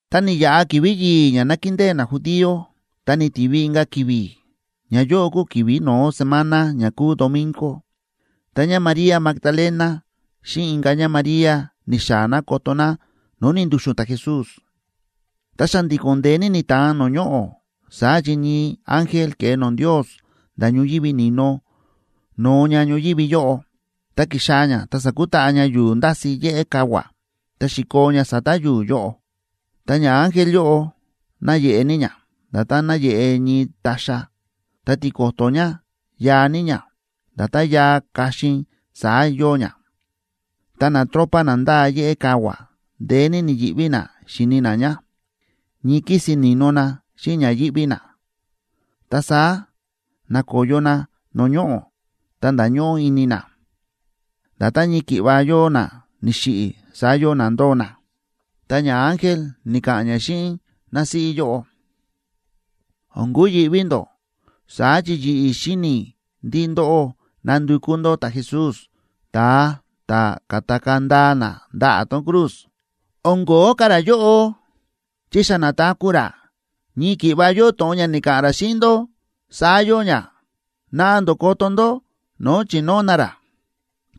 Ta ni̱yaꞌa ki̱vi̱ yi̱i̱ ña nákindée najudío, ta ni̱tivi inka̱ ki̱vi̱; ñayóꞌo kúu ki̱vi̱ no̱ó semana ña kúu domingo, ta ñáMaría Magdalena xíꞌin inka̱ ñáMaría ni̱xaa̱ ná koto ná no̱o̱ ni̱ndu̱xu̱n ta̱Jesús. Ta xa̱ndi̱ko̱n ndeé ní ni̱ta̱an no̱o̱ ñoꞌo̱, saá chi ñii ángel ke̱e no̱o̱ Ndios nda̱ ñoyívi ni̱no, no̱o ña ñoyívi yóꞌo, ta ki̱xaa̱ ña ta sa̱kutaꞌa ña yu̱u̱ ndási̱ yéꞌé kavua̱, ta xi̱koo ña sa̱ta̱ yu̱u̱ yóꞌo. Ta ñaángel yóꞌo náyeꞌe ní ña, nda̱tán náyeꞌe ñii ta̱xa̱, ta tiko̱to̱ ña yaa ní ña, nda̱tán yaa kaxin saá yóo ña. Ta natropa na ndáa yéꞌé kavua̱ ndeé ní ni̱yi̱ꞌví na xíni na ña, ñii kísin ni̱no na xíꞌin ña yíꞌví na, ta saá na̱koyo na no̱o̱ ñoꞌo̱ ta nda̱ñóꞌó ini na. Nda̱tán ñii ki̱ꞌva yóo na ni̱xiꞌi̱, saá yóo na ndóo na. Ta ñaángel ni̱ka̱ꞌa̱n ña xíꞌin násíꞌí yóꞌo: ―O̱n kuyi̱ꞌví ndó, saá chi yi̱ꞌi̱ xíni̱ i̱ ndí ndóꞌó nándukú ndó ta̱Jesús, ta̱a ta̱ ka̱takaa̱ ndaa na ndaꞌa̱ tón cruz. O̱n ko̱ó ka̱ ra yóꞌo, chi xa na̱taku̱ ra, ñii ki̱ꞌva yóo to̱ꞌon ña ni̱ka̱ꞌa̱n ra xíꞌin ndó, saá yóo ña. Naꞌa ndó koto ndó no̱o̱ chi̱nóo na ra.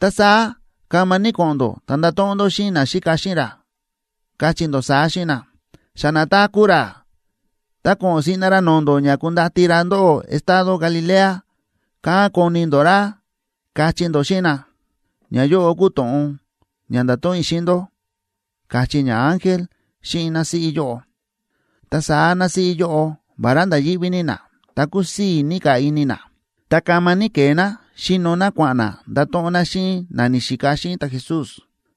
Ta saá kama ní ko̱ꞌo̱n ndó ta ndato̱ꞌon ndó xíꞌin na ni̱xika xíꞌin ra, kachí ndó saá xíꞌin na: “Xa na̱taku̱ ra, ta ko̱ꞌo̱n siꞌna ra no̱o̱ ndó ña kundati ra ndóꞌó estado Galilea. Kán koni ndó ra”, kachí ndó xíꞌin na. Ñayóꞌo kúu to̱ꞌon ña ndáto̱ꞌon i̱ xíꞌin ndó ―káchí ñaángel xíꞌin násíꞌí yóꞌo. Ta saá násíꞌí yóꞌo vará nda̱ yíꞌví ní ná, ta kúsii̱ ní ka̱ ini ná, ta kama ní ke̱e ná xíno ná kua̱ꞌa̱n ná ndato̱ꞌon ná xíꞌin na ni̱xika xíꞌin ta̱Jesús.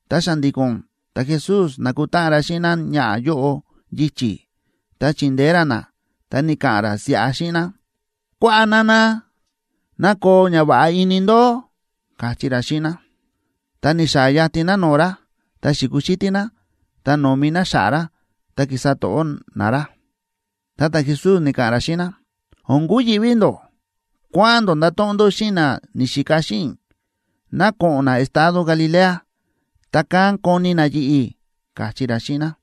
Ta xa̱ndi̱ko̱n ta̱Jesús na̱kutáꞌan ra xíꞌin náñaꞌa̱ yóꞌo yichi̱, ta chi̱ndeé ra ná ta ni̱ka̱ꞌa̱n ra siꞌa xíꞌin ná: ―Kuaꞌa, nana. Ná koo ñava̱ꞌa ini ndó ―káchí ra xíꞌin ná. Ta ni̱xaa̱ yatin ná no̱o̱ ra, ta xi̱kuxítí ná ta no̱mi ná xa̱ꞌa̱ ra ta ki̱sa to̱ꞌó ná ra. Ta ta̱Jesús ni̱ka̱ꞌa̱n ra xíꞌin ná: ―O̱n kuyi̱ꞌví ndó. Kua̱ꞌa̱n ndó ndato̱ꞌon ndó xíꞌin na ni̱xika xíꞌin i̱ ná ko̱ꞌo̱n na estado Galilea, ta kán koni na yi̱ꞌi̱ ―káchí ra xíꞌin ná.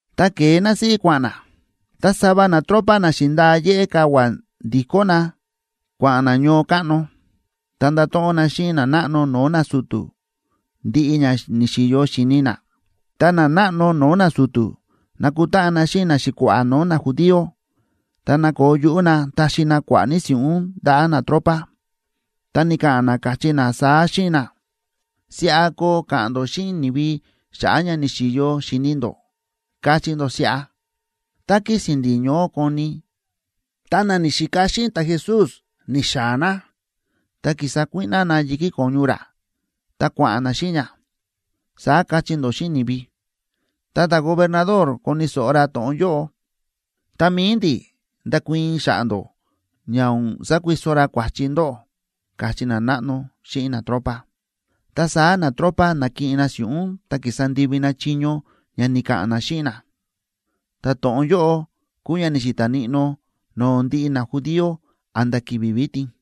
Ta ke̱e násíꞌí kua̱ꞌa̱n ná, ta sava natropa na xi̱ndaa yéꞌé kavua̱ ndi̱kó na kua̱ꞌa̱n na ñoo káꞌno, ta nda̱to̱ꞌon na xíꞌin nanáꞌno no̱o̱ nasu̱tu̱ ndiꞌi ña ni̱xi̱yo xi̱ni na. Ta nanáꞌno no̱o̱ nasu̱tu̱ na̱kutáꞌan na xíꞌin naxi̱kua̱ꞌa̱ no̱o̱ najudío, ta na̱koo yuꞌú na taxi na kua̱ꞌa̱ ní si̱ꞌún ndaꞌa̱ natropa, ta ni̱ka̱ꞌa̱n na, káchí na saá xíꞌin na: ―Siꞌa koo ka̱ꞌa̱n ndó xíꞌin ni̱vi xa̱ꞌa̱ ña ni̱xi̱yo xi̱ni ndó, kachí ndó siꞌa: “Tá kísi̱n ndi̱ ñoó koni, ta na ni̱xika xíꞌin ta̱Jesús ni̱xaa̱ na, ta ki̱sa kuíꞌná na yi̱kí ko̱ñu ra, ta kua̱ꞌa̱n na xíꞌin ña”, saá kachí ndó xíꞌin ni̱vi. Tá ta̱gobernador koni̱ so̱ꞌo ra to̱ꞌon yóꞌo, ta mi̱i ndi̱ ndakuii̱n xa̱ꞌa̱ ndó, ña o̱n sakuiso ra kua̱chi ndóꞌó ―káchí nanáꞌno xíꞌin natropa. Ta saá natropa na̱kiꞌin na si̱ꞌún ta ki̱sa ndivi na chiño ña ni̱ka̱ꞌa̱n na xíꞌin na. Ta to̱ꞌon yóꞌo kúu ña ni̱xi̱ta̱ níꞌnó no̱o̱ ndiꞌi najudío a̱nda̱ ki̱vi̱ vitin.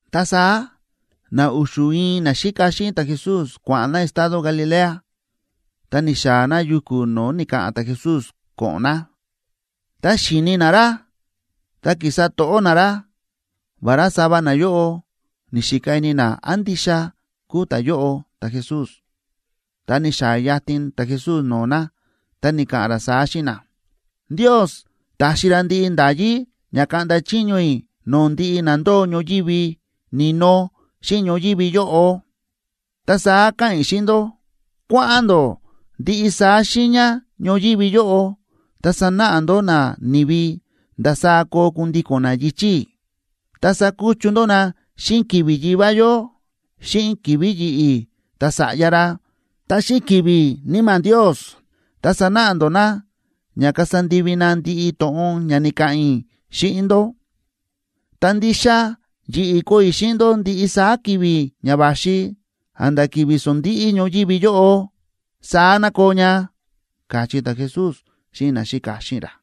Ta saá na u̱xu̱ ñii naxíka xíꞌin ta̱Jesús kua̱ꞌa̱n na estado Galilea, ta ni̱xaa̱ na yuku̱ no̱o̱ ni̱ka̱ꞌa̱n ta̱Jesús ko̱ꞌo̱n na. Ta xi̱ni na ra ta ki̱sa to̱ꞌó na ra, vará sava nayóꞌo ni̱xika ini na án ndixa kúu ta̱yóꞌo ta̱Jesús. Ta ni̱xaa̱ yatin ta̱Jesús no̱o̱ na ta ni̱ka̱ꞌa̱n ra saá xíꞌin na: ―Ndios ta̱xi ra ndiꞌi nda̱yí ña kaꞌnda chiño i̱ no̱o̱ ndiꞌi na ndóo ñoyívi ni̱no xíꞌin ñoyívi yóꞌo. Ta saá káꞌa̱n i̱ xíꞌin ndó: Kua̱ꞌa̱n ndó ndiꞌi saá xiiña ñoyívi yóꞌo ta sanáꞌa ndó nani̱vi ndasaá koo kundíko̱n na yichi̱ i̱, ta sakuchu ndó na xíꞌin ki̱vi̱ Yivá yó, xíꞌin ki̱vi̱ yi̱ꞌi̱ ta̱Sa̱ꞌya ra, ta xíꞌin ki̱vi̱ Níma̱ Ndios. Ta sanáꞌa ndó na ña kasa ndivi na ndiꞌi to̱ꞌon ña ni̱ka̱ꞌa̱n i̱ xíꞌin ndó. Ta ndixa yi̱ꞌi̱ koo i̱ xíꞌin ndó ndiꞌi saá ki̱vi̱ ña va̱xi a̱nda̱ ki̱vi̱ sondíꞌí ñoyívi yóꞌo. Saá ná koo ña ―káchí ta̱Jesús xíꞌin naxíka xíꞌin ra.